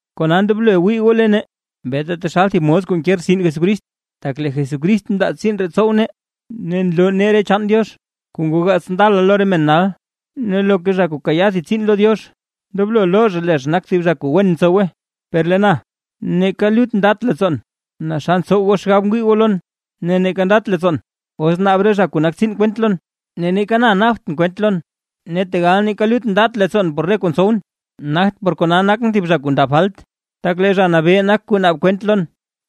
Kona ndoblo wii goo lo nee beeta taxal thib mos kuu nke rtsin Jesucrist, tak lee Jesucrist mndaa tsiin ree tsow nee, ne nloo nee re chaan Diox kuu ngoo gaats ndala lo re men nal. Ne loka zha kuu kayaa thib tsiin lo Diox, ndoblo loo zha lee zha nak thib zha kuu wen tsowe. Per lee na, neeka lut ndat leettsoon naa xa ntsow goo xgab ngwii goo lon, ne neeka ndat leettsoon, os naab re zha kuu nak tsiin kwent lon, ne neeka na naabt kwent lon. Ne tegal neeka lut ndat leettsoon por re kuu ntsowʼn, nagt por kona nakʼn thib zha kuu ndabt falt. Tak lee Zha Nabee nak kuu naab kwent lon.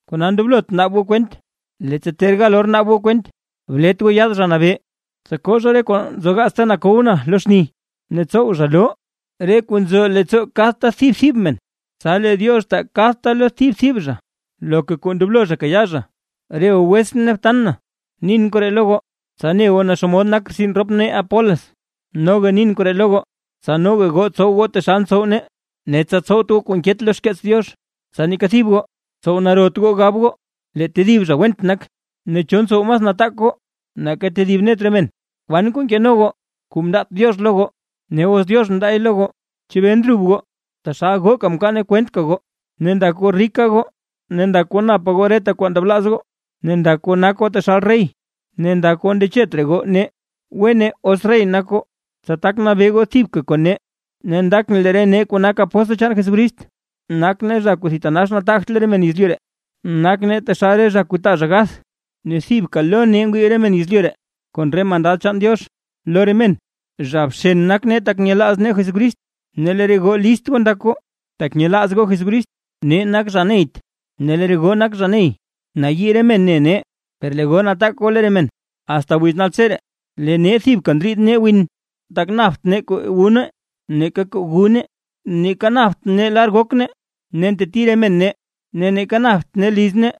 Kona ndoblot naab goo kwent, leettsa ter gal or naab goo kwent, blet goo yaad Zha Nabee, tsa koo zha re kuu nzogaats lo yalkow lo xni, ne tsow zha loo re kuu nzo leettsoo kadta thib thib men. Tsa lee Diox taa lo kadta thib thib zha loka kuu ndoblo zha kayaa zha. Re goo wetsʼn ne btan na, nin koree lo goo, tsa ne goo naa xomod nak rtsin rop nee Apolos. Noga nin koree lo goo, tsa noga goo tsow goo taxal ntsow nee, ne tsa tsowt goo kuu nket lo xkeets Diox, tsa neeka thib goo, tsow narot goo gab goo lee tedib zha went nak. Ne, ¿cho ntsow mas nataak goo nake tedib net re men? ¿Kwan kuu nkeno goo kuu mndaat Diox lo goo? Ne os Diox mndaay lo goo, ¿chebee ndrub goo taxal gooka mkwaan gooy kwentka goo? Ne ndak goo rika goo, ne ndak goo napa goo reta kuu ndablaaz goo, ne ndak goo nak goo taxal rey, ne ndak goo ndechet raa goo nee. ¡Wene os rey nak goo, tsa tak nabee goo thibka kon nee! Ne ndakʼn lee re nee kuu nak apóstl chaan Jesucrist, nak nee zha kuu thitanax nataagt lo re men yezlyu ree. Nak nee taxal re zha kuu taa zha gath; ne thibka lo nee ngwii re men yezlyu ree kon re mandad chaan Diox. Lo re men, zha bxen nak nee tak nyelaaz nee Jesucrist, ne lee re goo list goo ndak goo, tak nyelaaz goo Jesucrist. Nee nak zha neyt ne lee re goo nak zha ney. Nayii re men ne nee per lee goo nataak goo lo re men. Asta wiz naltseree, lee nee thibka ndriid nee win, tak napt nee kuu wu nee neeka kuu gu nee, neeka napt nee lar gok nee, ne nteti re men nee, ne neeka napt nee liz nee,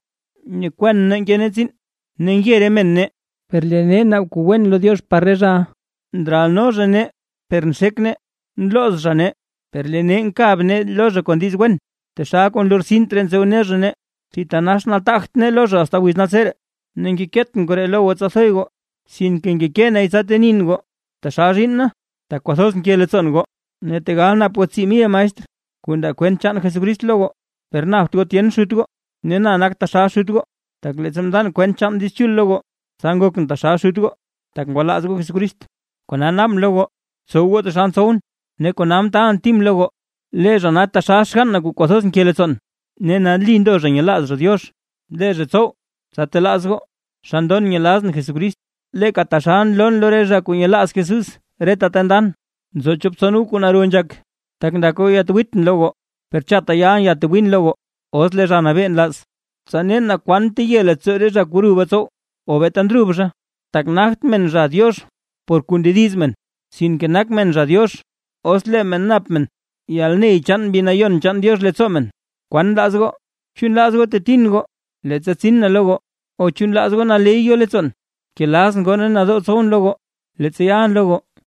nyekwan nee nke nee tsiin. Ne nge re men nee, per lee nee naab kuu wen lo Diox par re zhaʼa. Ndralno zha nee per nxek nee. Nlooz zha nee, per lee nee nkab nee lo zha kon diiz wen. Taxal kuu lortsint raa ntsowno zha nee, ne thitanax nataagt nee lo zha asta wiz naltseree. Ne ngekeetʼn koree lo goo tsa thoy goo, sinke ngekee nay tsa tenin goo, taxal zhiinn na, tak kwathoz nke leettsoon goo. Ne tegal nap goo tsii mil maestr kuu ndaa kwent chaan Jesucrist lo goo, per napt goo tyen xut goo. Ne na nak taxal xut goo, tak leettsa mndan kwent chaan Diiz Chul lo goo, tsa ngokʼn taxal xut goo, tak ngwalaaz goo Jesucrist. Kona naabʼn lo goo, btsow goo taxal ntsowʼn. Ne kona mtaalʼn Tim lo goo. Lee zha nak taxal xgann na kuu kwathoz nke leettsoon, ne nali ndo zha nyelaaz zha Diox. Lee zha tsow tsa telaaz goo xa ndon nyelazʼn Jesucrist, leeka taxal nloon lo re zha kuu nyelaaz Jesús reta ta ndan. Nzo chop tson goo kuu naro nzhak, tak ndak goo yatwiitʼn lo goo; per chatta yalʼn yatwiin lo goo, os lee Zha Nabee nlaaz. Tsa nen naa kwan teye leettsoo re zha ruba tsow, o beeta ndrub zha. Tak nagt men zha Diox por kuu ndediz men, sinke nak men zha Diox, os lee men nap men yalney chaan Mbi Nayon chaan Diox leettsoo men. ¿Kwan nlaaz goo? ¿Chu nlaaz goo tetin goo, leettsa tsin na lo goo, o chu nlaaz goo naley yo leettsoon, kelazʼn goo ne nadoo tsowʼn lo goo, leettsa yalʼn lo goo?